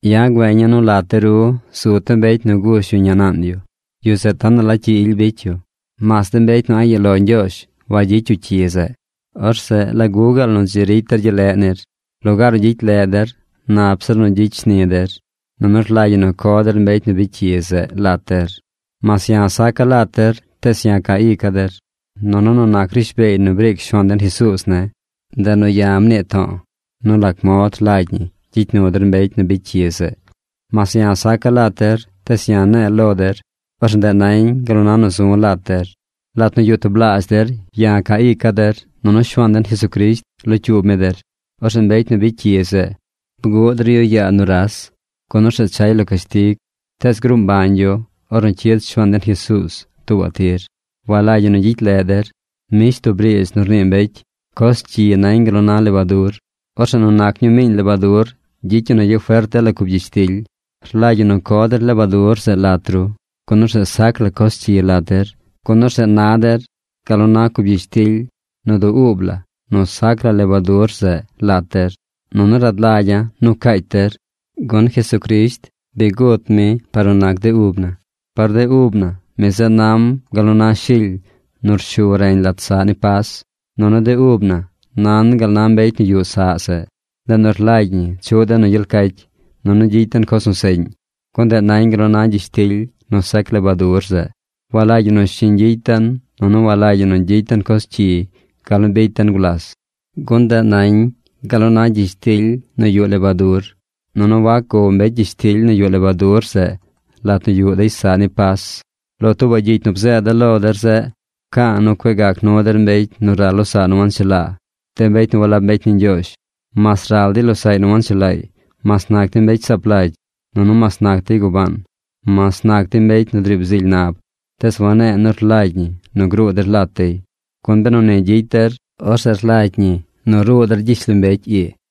Ya̱ güeña̱ nu lat de ru, zu tub mbecy nu gush yu ñaa naan yu. Yu zeꞌ tonaꞌ la cyi ily bicy yu. Mas de mbecy nu a̱ꞌ yuꞌ lo Ñgyoozh wagyicy yu cyi zeꞌ. Orzeꞌ ¿lagu gaal nu dzi ricy der gyel leꞌ nir? Lugaar nu gyicy leꞌ der, nap zir nu gyicy shni der, nunu rlagy ñi co der mbecy nu bicy cyi zeꞌ lat der. Mas ya̱ saca̱ lat der tees ya̱ ca ica̱ der. Nunu nu nac rishbeey nu briic Shuaan den Jesuuz ne̱, ndeꞌ nu ya̱ mnii to̱o̱ nu lac mod rlagy ñi gyicy nu der mbecy nu bicy cyi zeꞌ. Mas ya̱ saca̱ lat der tees ya̱ ne̱e̱ lo der. Orzeꞌ ndeꞌ nañ gal na nu zu̱ lat der. Lat nu yuꞌ tublaazh der, ya̱ ca ica̱ der, nunu Shuaan den Jesucrisht locyuub mi der. Orzeꞌ mbecy nu bicy cyi zeꞌ, bguꞌ der yu yaa nuras, gun orzeꞌ chay lo cashtig, tees gruu mbañ yu ornu cyid Shuaan den Jesuuz tuubaꞌ tir. Walagy ñi nu gyicy leꞌ der. Mbish tub riidz nu rnii mbecy: coz cyi nañ gal nu na lebadur. Orzeꞌ nu nac ñuu miiñ lebadur gyicy ñi nu gyafert dela cub gyishtily. Rlagy ñi nu co der lebadur zeꞌ lat ru. Gun orzeꞌ sac la coz cyi lat der. Gun orzeꞌ na der gal nu na cub gyishtily nu du ub la nu sac la lebadur zeꞌ lat der. Nunu rad lagya̱ nu caacy der, gun Jesucrisht bi gut mi par nu nac de ub na. Par de ub na, mi zeꞌ nam gal nu na shily nu rshu reñ lat saꞌ ni Pas. Nunu de ub na nan gal na mbecy nu yuꞌ saꞌ zeꞌ. Ndeꞌ nu rlagy ñi chuꞌ den nu gyel cacy, nunu gyicy den coz nu seꞌñ. Gun ndeꞌ nañ gal nu na gyishtily nu sac lebadur zeꞌ. Walagy ñi nu shiñ gyicy den nunu walagy ñi nu gyicy den coz cyi gal nu bicy den gulas. Gun ndeꞌ nañ gal nu na gyishtily nu yuꞌ lebadur. Nunu wac gow mbecy gyishtily nu yuꞌ lebadur zeꞌ lat nu yuꞌ dey saꞌ ni Pas. Lo tuubaꞌ gyicy nu bzeeda̱ lo der zeꞌ, pca̱a̱ nu cueꞌ gac nu der de mbecy nu ral losaꞌ nu wanchelaa. De mbecy nu walab mbecy ni Ñgyoozh, mas ral dey losaꞌy nu wanchelaay, mas nac dey mbecy saap lagy, nunu mas nac dey gubaan, mas nac dey mbecy nu driib zily nab, tees wane̱e̱ nu rlagy ñi nu gruu der lat dey, gun benu ni gyicy der, orzeꞌ rlagy ñi nu ruu der gyishlombecy ii.